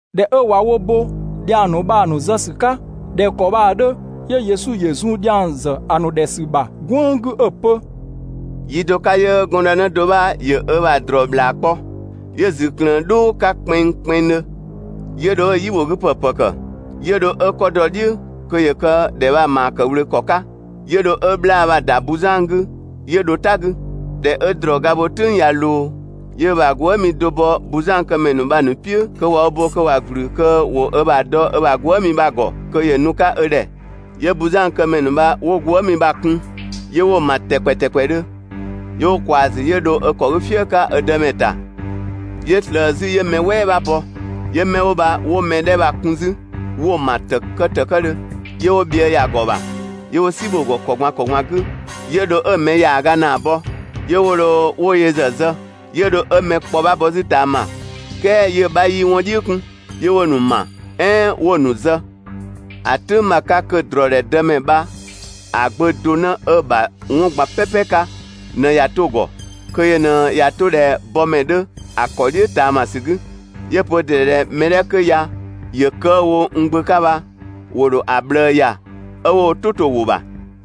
꞊Dhɛ 'ö ꞊wa wo bo dhiang ‑nu bha‑ ‑nu zë ‑sü 'ka ꞊dhɛ ‑kɔ bha‑ 'dhö, 'yö Yesu ‑yö zun dhiang ‑zë ‑a ‑nu ‑dhɛ ‑sü ‑bha "gwënng 'gü 'ö‑ pö: «Yi do 'ka 'yö gɔndë do 'bha ‑yö ö ‑bha ‑drɔɔ ‑bhlaa kpɔ. 'Yö‑ ‑zü ꞊klëën "dhʋʋ 'ka kpɛnngkpɛnngdhö, 'yö dho 'ö‑ "yibhogüpë ‑pë ‑kë, 'yö dho 'ö 'kɔ dɔ‑ "dhiʋ̈ (kö ‑yö kë ‑dhɛ bha‑ ‑maa ‑kë ꞊wlöö ‑kɔ 'ka), 'yö dho 'ö 'bhlaa‑ bha‑ ‑da buzan 'gü 'yö dho "ta 'gü. ꞊Dhɛ 'ö ‑drɔɔ ga bho "tʋ̈ng ꞊ya ꞊loo, 'yö ö ‑bha gwëëmi do bɔ buzankëmɛ ‑nu bha‑ ‑nu "piʋ̈ kö ꞊wa wo bo kö ‑wa ‑gblü kö ‑wo ö ‑bha dɔ ö ‑bha gwëëmi bha‑ ‑gɔ kö ‑yö nu‑ 'ka ö ‑dhɛ. 'Yö buzankëmɛ ‑nu bha 'wo gwëëmi bha‑ kun, 'yö 'wo‑ ‑ma ‑tɛkpɛ ‑tɛkpɛdhö 'wo wo ꞊kwaa‑ ‑zü 'yö dho ö ‑kɔ 'gü "fië 'ka ö dëmɛ ‑ta. 'Yö ꞊slëë 'zü 'yö mɛ "wɛɛ 'bha bɔ, 'yö 'mɛ 'wo bha 'wo mɛ 'dhɛ bha‑ kun 'zü 'wo‑ ‑ma ‑tëkë ‑tëkëdhö, 'yö 'wo bhië ‑ya ‑gɔ ‑bha, 'yö 'wo "si bho‑ ‑gɔ ‑kɔ ꞊gban ‑kɔ ꞊gban 'gü 'yö dho 'ö‑ mɛ ‑yaaga ‑naa bɔ, 'yö 'wo dho 'wo yö ‑zë zë, 'yö dho 'ö mɛ kpɔ 'bha bɔ 'zü ꞊taama, "kɛɛ 'yö‑ 'bha 'yii 'wɔn "dhiʋ̈ 'kun, 'yö 'wo‑ ‑nu ‑ma, "ɛɛn 'wo‑ ‑nu zë. ‑A "tʋ̈ng bha‑ 'ka kö ‑drɔɔdhɛ dëmɛ bha‑ gbö do 'në 'ö‑ ‑bha 'wɔn ꞊gban "pɛpɛ 'ka ꞊në ꞊ya 'to‑ ‑gɔ, kö yö ꞊në ꞊ya 'to ꞊dhɛ bɔmɛ 'dhö ‑a ‑kɔ "dhiʋ̈ ꞊taamasü 'gü. 'Yö‑ pö ö ‑dɩ ‑dhɛ ꞊dhɛ mɛ 'dhɛ 'kö ya ‑yö kë 'ö‑ wo n gbö 'ka bha, ‑wo ‑dho ‑a ꞊bhlëë ‑ya 'ö 'wo wo "tʋ to‑ ‑wʋ ‑bha.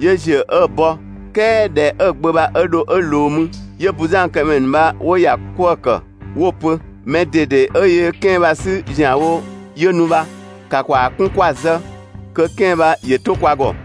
'Yö ‑ziö 'ö‑ bɔ, "kɛɛ ꞊dhɛ 'ö‑ gbö bha 'ö dho 'ö ꞊loo mü, 'yö buzankëmɛ ‑nu bha 'wo‑ ‑ya 'kwëë‑ ‑kë 'wo‑ pö: «Mɛ ꞊dede 'ö yöö 'kɛan‑ bha‑ 'sü ‑zianwo 'yö nu bha, ‑ka ‑kwaa 'kun 'kwa‑ zë, kö 'kɛan‑ bha ‑yö 'to kwa ‑gɔ!»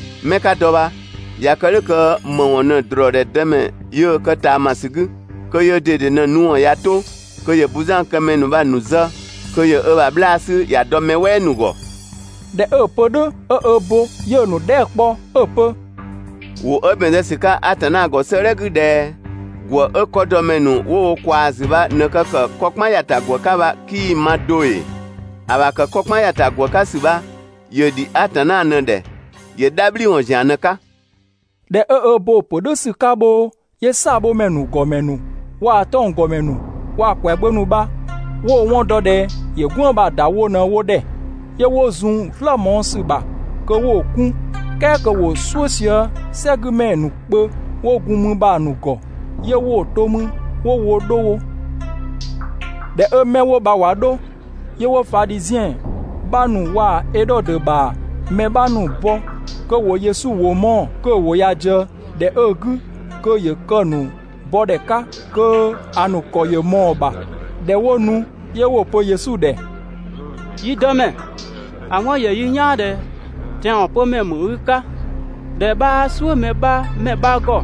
'Mɛ 'ka dɔ bha, ꞊ya kë "dhʋ̈ kö ‑më ‑wɔn ꞊në ‑drɔɔdhɛ dëmɛ yöö kë ꞊taamasü 'gü? Kö yöö ꞊dede ꞊në‑ nu ‑wɔn ꞊ya 'to, kö ‑yö buzankëmɛ ‑nu bha‑ ‑nu zë, kö ‑yö ö bha 'bhlaa‑ 'sü ‑ya dɔ mɛ "wɛɛ ‑nu ‑gɔ.» ꞊Dhɛ 'ö‑ pö "dhʋ̈ 'ö ö bo, 'yö‑ ‑nu dhɛɛ" kpɔ 'ö‑ pö: «‑Wʋ 'ö ‑bɛn zë ‑sü 'ka Atanna ‑gɔ 'sëëdhɛ 'gü ꞊dhɛ: ‹‑Gwë 'ö 'kɔdɔmɛ ‑nu 'wo wo ꞊kwaa‑ ‑zü bha ꞊në kë ‑kë 'kɔ "kpan ‑ya ‑ta ‑gwë 'ka bha 'kii‑ ma do ‑ee? ‑A ‑bha ‑kë 'kɔ "kpan ‑ya ‑ta ‑gwë 'ka ‑sü bha, ‑yö ‑dhi Atanna ꞊në‑ ‑dhɛ, ‑yö "dhabhliwɔn ‑zian ꞊në‑ 'ka.›» ꞊Dhɛ 'ö ö bo‑ ‑pö "dhʋ̈ ‑sü 'ka bhoo, 'yö "saabhomɛ ‑nu ‑gɔmɛ ‑nu waa‑ 'tɔnggɔmɛ ‑nu waa‑ ‑kwɛagbö ‑nu bha 'wo‑ 'wɔn dɔ ꞊dhɛ ‑yö "gwënng bha‑ ‑da wo ꞊në wo ‑dhɛ. 'Yö 'wo zun‑ "slë mɔɔ‑ ‑sü ‑bha kö 'wo‑ 'kun, "kɛɛ kö ‑wo "suʋ̈ sië "sɛgümɛ ‑nu kpö 'wo gun 'mü bha‑ ‑nu ‑gɔ, 'yö 'wo‑ to 'mü 'wo woo‑ 'dho wo. ꞊Dhɛ 'ö 'mɛ 'wo bha 'wo dho, 'yö 'wo Fadhiziɛn 'bha ‑nu waa‑ Edhodö ‑bha mɛ 'bha ‑nu bɔ kö ‑wo Yesu ‑wʋ mɔɔ‑, kö‑ ‑wʋ ꞊ya ꞊dië ‑dhɛ 'ö‑ 'gü kö ‑yö kë‑ ‑nu bɔdhɛ 'ka kö‑ ‑nu ‑kɔ ‑yö ꞊mɔɔ‑ ‑bha. ꞊Dhɛ 'wo nu, 'yö 'wo‑ pö Yesu ‑dhɛ: «Yi Dëmɛ, ‑a 'wɔn ‑yö yi "yaan ꞊dhɛ tɛanwɔn pömɛ ‑mü i 'ka, ꞊dhɛ 'bhaa "suʋ̈ mɛ 'bha ‑mɛ 'bha ‑gɔ,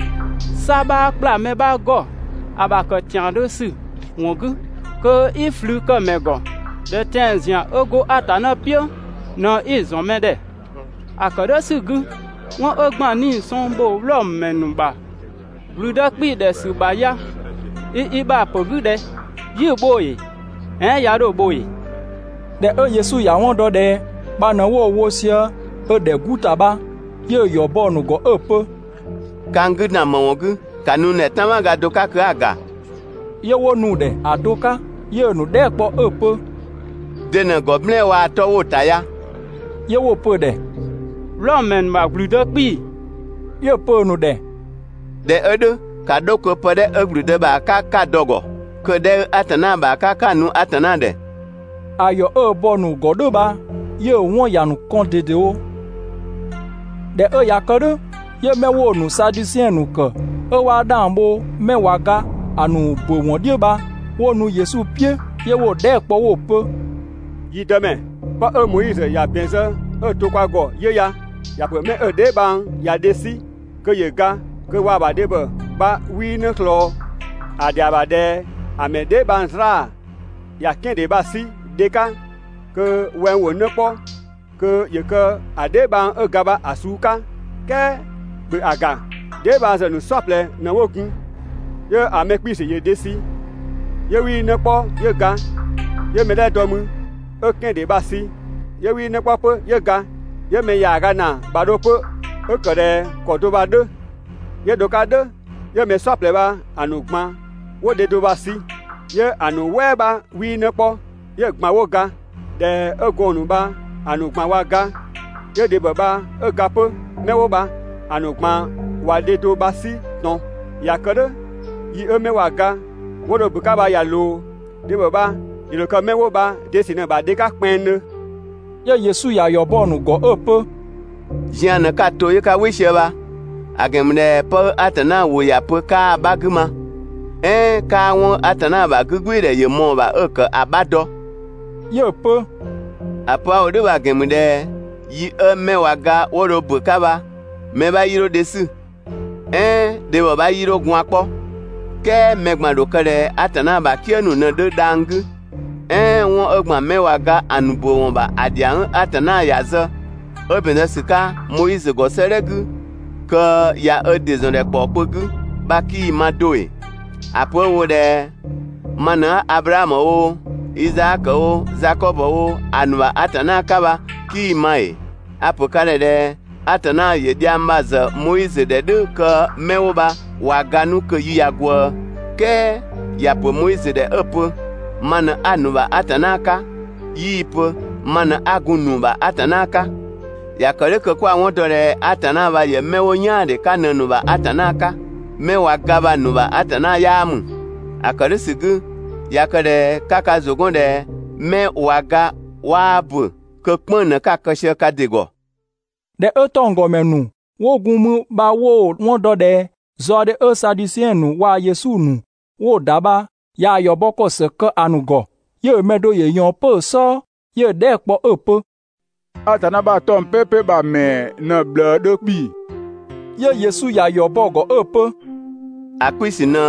'sa 'bhaa ‑kpla mɛ 'bha ‑gɔ ‑a ‑bha ‑kë ‑tiandhö ‑sü ‑wɔn 'gü kö i ꞊flü kë mɛ ‑gɔ, ꞊dhɛ tɛan‑ ‑zian 'ö go Atanna "piʋ̈ ꞊në 'i‑ ‑zɔn mɛ ‑dhɛ. ‑A ‑kë "dhʋ̈ ‑sü 'gü, 'wɔn 'ö ‑gban 'nii‑ sɔng ‑bho Wlɔmö ‑mɛ ‑nu ‑bha ‑gblüdë 'kpii‑ ‑dhɛ ‑sü ‑bha ya i i ‑bha ‑pö 'gü ꞊dhɛ? 'Yi‑ bho ‑ee? "Ɛɛn 'ya 'dho‑ bho ‑ee?» ꞊Dhɛ 'ö Yesu ‑ya 'wɔn dɔ ꞊dhɛ kpa ꞊në 'wo‑ wo sië ö ‑dhɛ 'gu ‑ta bha, 'yö‑ ‑yɔ bɔ‑ ‑nu ‑gɔ 'ö‑ pö: «Ka n 'gü ‑dan ‑më ‑wɔn 'gü? ‑Ka nu n ‑dhɛ "tanmaga do 'ka kö 'a‑ ‑ga!» 'Yö 'wo nu‑ ‑dhɛ ‑a do 'ka. 'Yö‑ ‑nu dhɛɛ" kpɔ 'ö‑ pö: «De ꞊në‑ ‑gɔ "blɛɛn‑ waa‑ 'tɔ 'wo‑ ‑ta ya?» 'Yö 'wo‑ pö‑ ‑dhɛ: «Wlɔmö ‑mɛ ‑nu ‑bha ‑gblüdë 'kpii‑.» 'Yö‑ pö‑ ‑nu ‑dhɛ: «꞊Dhɛ 'ö "dhʋ̈, ‑ka 'dho kö pë 'dhɛ 'ö ‑gblüdë bha‑ ‑bha 'ka 'ka‑ dɔ‑ ‑gɔ, kö‑ 'dhɛ 'ö Atanna ‑bha 'ka 'ka‑ nu Atanna ‑dhɛ!» ‑A ‑yɔ 'ö‑ bɔ‑ ‑nu ‑gɔ "dhʋ̈ bha, 'yö‑ 'wɔn ‑ya ‑nu kɔn ꞊dedewo. ꞊Dhɛ 'ö ꞊ya kë "dhʋ̈, 'yö 'mɛ 'wo‑ ‑nu Sadusiɛn ‑nu ‑kë 'ö 'waa 'dhang bho 'mɛ ꞊wa ga ‑a ‑nu ‑bö ‑wɔn "dhiʋ̈ bha, 'wo nu Yesu "piʋ̈, 'yö 'wo‑ dhɛɛ" kpɔ 'wo‑ pö: «Yi Dëmɛ, 'pë 'ö Moizö ‑ya ‑bɛn zë 'ö‑ to kwa ‑gɔ 'yö ya. ‑Ya ‑pö 'mɛ 'ö‑ dheebhang ꞊ya dhe 'sü, kö ‑yö ga kö waa‑ ‑bha dhebhɔ bha 'wii 'në ꞊slɔɔ, ‑a ‑dhɛa ‑bha ꞊dhɛ ‑a ‑mɛ dheebhang 'zlaa‑ ‑ya 'kɛandhe bha‑ 'sü dhe 'ka kö wɛng ‑wo 'në 'kpɔ kö ‑yö kë‑ dheebhang 'ö ga bha‑ suu 'ka. "Kɛɛ ‑bhö ‑a ‑ga, dheebhangzë ‑nu "saɔplɛ ꞊në 'wo gun, 'yö‑ mɛ 'kpiisü ‑yö dhe sü, 'yö 'wii 'në 'kpɔ 'yö ga. 'Yö 'mɛ 'dhɛ dɔ mü 'ö‑ 'kɛan‑ ‑dhe bha‑ sü, 'yö 'wii 'në 'kpɔ 'pö, 'yö ga. 'Yö‑ mɛ ‑yaaga ‑naa ‑bha dho 'pö 'ö ‑kë ‑dhɛ ‑kɔ do bha‑ 'dhö, 'yö dho‑ 'ka "dhʋ̈ 'yö mɛ "saɔplɛ bha‑ ꞊gban 'wo dhe do bha‑ sü, 'yö‑ ‑nu "wɛɛ 'bha 'wii 'në 'kpɔ, 'yö‑ ꞊gban ‑wo ga. ꞊Dhɛ 'ö gɔɔn‑ ‑nu bha‑ ‑nu ꞊gban ꞊wa ga, 'yö dhebhɔ bha 'ö ga 'pö. 'Mɛ 'wo bha‑ ‑nu ꞊gban ꞊wa dhe do bha‑ 'sü ꞊tɔn. ꞊Ya kë "dhʋ̈ yi 'ö 'mɛ ꞊wa ga 'wo dho bɔ‑ 'ka bha ꞊ya ꞊loo, dhebhɔ bha‑ ‑dho kë 'mɛ 'wo bha‑ de ‑sü ꞊në‑ bha dhe 'ka kpɛnngdhö?» 'Yö Yesu ‑ya ‑yɔ bɔ‑ ‑nu ‑gɔ 'ö‑ pö: «Zian ꞊në 'ka‑ to 'yö 'ka "wɩ sië bha, ‑a ‑gɛn ‑mü ꞊dhɛ 'pë 'ö Atanna ‑wʋ ‑ya pö 'kaa 'bha 'gü ma, "ɛɛn 'kaa 'wɔn 'ö Atanna ‑bha 'gügbɩɩdhɛ ‑yö ꞊mɔɔ‑ ‑bha 'ö‑ ‑kë ‑a 'bha dɔ.» 'Yö‑ pö: «‑A pö 'a‑ wo "dhʋ̈ bha‑ ‑gɛn ‑mü ꞊dhɛ yi 'ö 'mɛ ꞊wa ga 'wo dho ‑bö 'ka bha, mɛ 'bha 'yii 'dho dhe 'sü, "ɛɛn dhebhɔ 'bha 'yii 'dho gwaan‑ 'kpɔ, "kɛɛ mɛ ꞊gban ‑dho kë ꞊dhɛ Atanna ‑bha "kië ‑nu ꞊në‑ 'dhö dhang‑ 'gü. "Ɛɛn 'wɔn 'ö ‑gban 'mɛ ꞊wa ga 'nu ‑a ‑nu ‑bö ‑wɔn ‑bha ‑a ‑dhiang 'ö Atanna ‑ya zë, 'ö ‑bɛn zë ‑sü 'ka Moizö ‑gɔ 'sëëdhɛ 'gü, kö ꞊ya ö ‑dɩ ‑zɔn ‑dhɛ ‑kpɔɔ kpö 'gü bha 'kii‑ ma do ‑ee? ‑A pö 'ö‑ wo ꞊dhɛ: ‹Ma ꞊në 'a Ablaamö oo, Izaakö oo, Zakɔbö oo, a ‑nu ‑bha Atanna 'ka› bha, 'kii‑ ma ‑ee? (A‑ ‑pö ka ‑dhɛ ꞊dhɛ Atanna ‑yö dhiang bha‑ zë Moizö ‑dhɛ "dhʋ̈ kö 'mɛ 'wo bha ꞊wa ga 'nu kö‑ yi ꞊ya ꞊gwëë. "Kɛɛ ‑ya ‑pö Moizö ‑dhɛ 'ö‑ pö: «Ma ꞊në 'a‑ ‑nu ‑bha Atanna 'ka», 'yii‑ pö: «Ma ꞊në 'a gun‑ ‑nu ‑bha Atanna 'ka.») ꞊Ya kë "dhʋ̈ kö kwa‑ 'wɔn ‑dɔ ꞊dhɛ Atanna bha ‑yö 'mɛ 'wo "yaandhe 'ka ꞊në‑ ‑nu ‑bha Atanna 'ka, 'mɛ ꞊wa ga bha‑ ‑nu ‑bha Atanna 'yaa ‑mü. ‑A ‑kë "dhʋ̈ ‑sü 'gü, ꞊ya kë ꞊dhɛ 'ka ka ‑zʋ 'gɔn ꞊dhɛ 'mɛ ꞊wa ga 'waa ‑bö, kö "kpënng‑ ꞊në 'ka‑ kë sië ka ‑dɩ ‑gɔ.» ꞊Dhɛ 'ö 'tɔnggɔmɛ ‑nu 'wo gun mü bha 'wo‑ 'wɔn dɔ ꞊dhɛ zaɔdhe 'ö Sadusiɛn ‑nu waa‑ Yesu ‑nu 'wo‑ ‑da bha ꞊yaa‑ ‑yɔ bɔ ‑kɔ ‑së kë ‑a ‑nu ‑gɔ, 'yö‑ ‑mɛ do ‑yö ꞊yɔɔn 'pö‑ "sɔɔ 'yö‑ dhɛɛ" kpɔ 'ö‑ pö: «Atanna ‑bha 'tɔng‑ "pɛpɛ bha‑ ‑mɛɛ ꞊në‑ ꞊bhlëë 'dhö 'kpii‑?» 'Yö Yesu ‑ya ‑yɔ bɔ‑ ‑gɔ 'ö‑ pö: «‑A 'kpiisü ꞊në: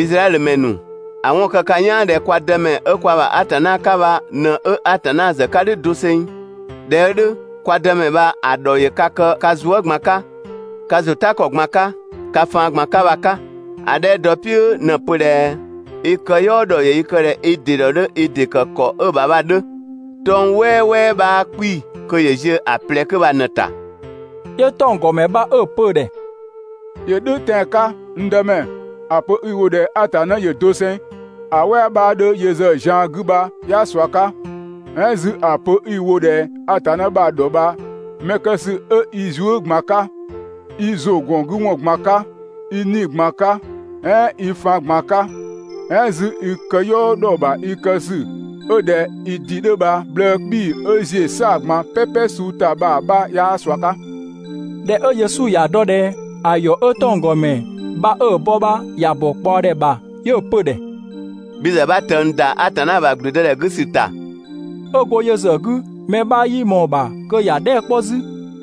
Izraɛdhö ‑mɛ ‑nu, ‑a 'wɔn kë ka "yaan ꞊dhɛ kwa Dëmɛ 'ö kwa ‑bha Atanna 'ka bha ꞊në 'ö Atanna ‑zë 'ka "dhʋ̈ doseng, ꞊dhɛ 'ö "dhʋ̈, kwa Dëmɛ bha‑ ‑dhɔ ‑yö ka kë ka zuë" ꞊gban 'ka, ka ‑zʋtakɔ ꞊gban 'ka, ka faan ꞊gban 'ka bha‑ 'ka. ‑A 'dhɛ dɔ‑ "piʋ̈ ꞊në‑ pö ꞊dhɛ: «I këyɔɔ ‑dhɔ ‑yö i kë ꞊dhɛ i ‑dɩ ‑dhɔ 'dhö i ‑dɩ ‑kë ‑kɔ 'ö‑ ‑bha bha‑ 'dhö.» 'Tɔng‑ "wɛɛwɛɛ 'bhaa 'kpii‑ kö ‑yö ziö ‑a ꞊plɛ 'kö bha ꞊në‑ ‑ta.» 'Yö 'tɔnggɔmɛ bha 'ö‑ pö‑ ‑dhɛ: ‑Yö "dhʋ̈ tɛan‑ 'ka, n Dëmɛ, ‑a pö 'i‑ wo ꞊dhɛ Atanna ‑yö doseng ‑a "wɛɛ 'bhaa 'dhö yö ‑zë zian 'gü bha 'yaa ꞊sua 'ka, "ɛɛn 'zü ‑a pö 'i‑ wo ꞊dhɛ Atanna bha‑ ‑dhɔ ‑bha mɛ kë ‑sü 'ö i zuë" ꞊gban 'ka, i ‑zʋgɔngüwɔn ꞊gban 'ka, i 'nii‑ ꞊gban 'ka, "ɛɛn i faan ꞊gban 'ka, "ɛɛn 'zü i këyɔɔ ‑dhɔ ‑bha i kë ‑sü 'ö ꞊dhɛ i ‑dɩ 'dhö bha‑ ꞊bhlëë‑ 'kpii‑ 'ö ‑ziö "saa‑ ꞊gban "pɛpɛ suu ‑ta bha‑ 'bha 'yaa ꞊sua 'ka. ꞊Dhɛ 'ö Yesu ‑ya dɔ ꞊dhɛ ‑a ‑yɔ 'ö 'tɔnggɔmɛ bha 'ö‑ bɔ bha ‑ya ‑bɔ ꞊kpaɔdhɛ ‑bha 'yö‑ pö‑ ‑dhɛ: «Bhi ‑zë 'bha ꞊tëng ‑da Atanna ‑bha ‑gblüdëdhɛ 'gü ‑sü ‑ta.» 'Ö go yö ‑zë 'gü, mɛ 'bha 'yii ꞊mɔɔ‑ ‑bha kö ‑ya dhɛɛ" 'kpɔ 'zü.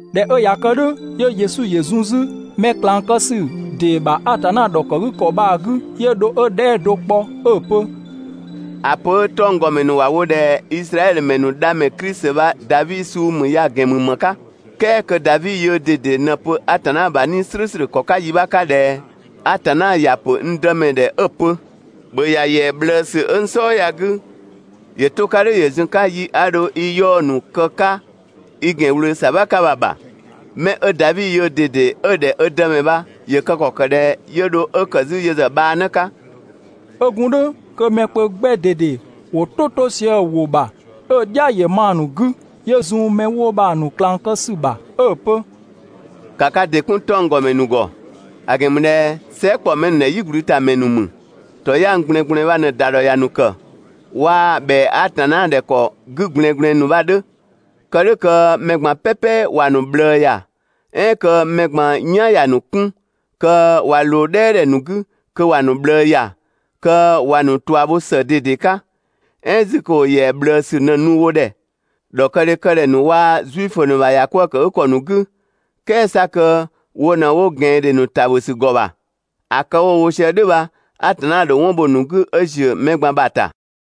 ꞊Dhɛ 'ö ꞊ya kë "dhʋ̈, 'yö Yesu ‑yö zun 'zü mɛ ꞊klang kë ‑sü ‑dee ‑bha Atanna ‑dhɔkëgükɔ bha‑ 'gü. 'Yö dho 'ö dhɛɛ" do kpɔ 'ö‑ pö: «‑A pö 'ö 'tɔnggɔmɛ ‑nu ‑wa wo ꞊dhɛ Izraɛdhö ‑mɛ ‑nu Dhamɛ Klisi bha Davi suu ‑mü ya‑ ‑gɛn ‑mü ‑më 'ka? "kɛɛ kö Davi yöö ꞊dede ꞊në‑ pö Atanna ‑bha 'Nii‑ "slʋ̈ʋ̈slʋ̈ ‑kɔ 'ka yi 'bha 'ka ꞊dhɛ: ‹Atanna ‑ya pö n Dëmɛ ‑dhɛ 'ö‑ pö: ‑Bhö ‑ya ‑yɛa ꞊bhlëësü 'ö n "sɔɔ ya‑ 'gü ‑yö 'to‑ 'ka "dhʋ̈ ‑yö zun‑ 'ka yi 'a dho i 'yaɔ‑ ‑nu kë‑ 'ka i ‑gɛn ꞊wlöö ‑sabha 'ka bha‑ ‑bha.› Mɛ 'ö Davi yöö ꞊dede 'ö‑ ‑dhɛ ö Dëmɛ bha, ‑yö kë ‑kɔ ‑kë ꞊dhɛ 'yö dho 'ö ‑kë 'zü yö ‑zë bhaanë 'ka?» 'Ö gun "dhʋ̈ kö mɛ kpö 'gbɛ ꞊dede ‑wo "tʋ 'to sië‑ ‑wʋ ‑bha 'ö‑ "dhia ‑yö ma‑ ‑nu 'gü. 'Yö zun 'mɛ 'wo bha‑ ‑nu ꞊klang kë ‑sü ‑bha 'ö‑ pö: «‑Ka ka ‑dɩ 'kun 'tɔnggɔmɛ ‑nu ‑gɔ. ‑A ‑gɛn ‑mü ꞊dhɛ sɛɛ" ‑kpɔ mɛ ‑nu ‑dhɛ "yigblütamɛ ‑nu ‑mü. ‑Tɔyang ꞊gblɛɛngblɛɛn bha ꞊në‑ ‑da ‑dhɔ ‑ya ‑nu ‑kë, waa‑ ‑bhɛa Atanna ‑dhɛ ‑kɔ 'gü ꞊gblɛɛngblɛɛn ‑nu bha‑ 'dhö, kë "dhʋ̈ kö mɛ ꞊gban "pɛpɛ ‑wa ‑nu ꞊bhlëë ‑ya, "ɛɛn kö mɛ ꞊gban "yan ‑ya ‑nu 'kun, kö ꞊wa ꞊loo "dhɛɛdhɛ ‑nu 'gü, kö ‑wa ‑nu ꞊bhlëë ‑ya, kö ‑wa ‑nu ꞊tua bho ‑së ꞊dede 'ka, "ɛɛn 'zü kö ‑wo ‑yɛa ꞊bhlëësü ꞊në‑ nu wo ‑dhɛ ‑dhɔkëdhɛ kë ‑dhɛ ‑nu waa‑ Zuifö ‑nu ‑bha ‑yakwëëkëgükɔ ‑nu 'gü, "kɛɛ 'sa kö wo ꞊në 'wo ꞊gɛandhe ‑nu ‑ta ‑bhö ‑sü ‑gɔ ‑bha. ‑A kë 'wo‑ wo sië "dhʋ̈ bha, Atanna ‑dho 'wɔn bho‑ ‑nu 'gü 'ö ‑ziö mɛ ꞊gban ‑bha ‑ta.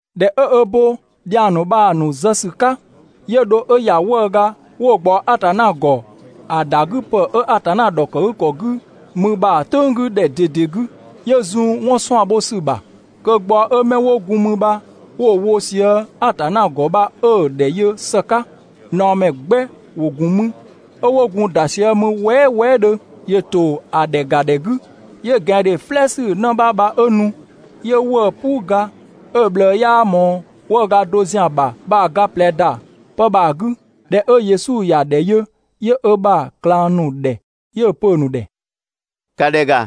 ꞊Dhɛ 'ö ö bo dhiang ‑nu bha‑ ‑nu zë ‑sü 'ka, 'yö dho 'ö ‑ya 'wëëga 'wo‑ ꞊gbaɔ Atanna ‑gɔ ‑a ‑dagüpë 'ö Atanna ‑dhɔkëgükɔ 'gü mü bha‑ "tʋ̈ng 'gü ꞊dhɛ ꞊dede 'gü. 'Yö zun 'wɔn 'suan‑ bho ‑sü bha kö gbaɔ‑ 'ö 'mɛ 'wo gun mü bha 'wo‑ wo sië‑ Atanna ‑gɔ bha 'ö‑ ‑dhɛ yö ‑së 'ka. ꞊Naɔmɛ 'gbɛ ‑wo ‑gun mü 'ö 'wo gun‑ ‑da sië mü wɛɛ" wɛɛdhö ‑Yö ‑to ‑a ‑dhɛ ‑ga ‑dhɛ 'gü, 'yö ꞊gɛandhe "flɛɛsü 'në 'bha bha 'ö nu, 'yö 'wëë‑ "puu ga 'ö‑ ꞊bhlëë 'yaa ꞊mɔɔ 'wëëga do ‑zian ‑bha bha‑ ga ꞊plɛ ‑da 'pë bha‑ 'gü. ꞊Dhɛ 'ö Yesu ‑ya ‑dhɛ yö, 'yö ö ‑bha ꞊klang ‑nu ‑dhɛ 'yö‑ pö‑ ‑nu ‑dhɛ: «‑Ka ‑dhɛ ‑ga,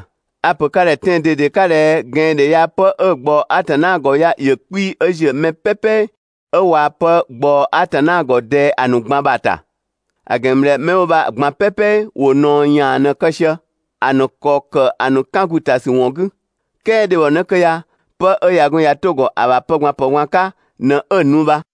a‑ ‑pö ka ‑dhɛ tɛan‑ ꞊dede 'ka ꞊dhɛ ꞊gɛandhe ya 'pë 'ö‑ ꞊gbaɔ Atanna ‑gɔ ya ‑yö 'kpii‑ 'ö ‑ziö mɛ "pɛpɛ 'ö ꞊wa pë ꞊gbaɔ Atanna ‑gɔ ꞊dɛɛ ‑a ‑nu ꞊gban ‑bha ‑ta. ‑A ‑gɛn ‑mü ꞊dhɛ 'mɛ 'wo bha‑ ꞊gban "pɛpɛ ‑wo ꞊naɔ ‑yaan ꞊në‑ kë sië, ‑a ‑nu ‑kɔ ‑kë ‑a ‑nu 'kën ‑gu ‑ta ‑sü ‑wɔn 'gü, "kɛɛ dhebhɔnë 'kö ya, 'pë 'ö ꞊ya gun ꞊ya 'to‑ ‑gɔ ‑a ‑bha pë ꞊gban ‑pë ꞊gban 'ka ꞊në 'ö‑ nu bha.»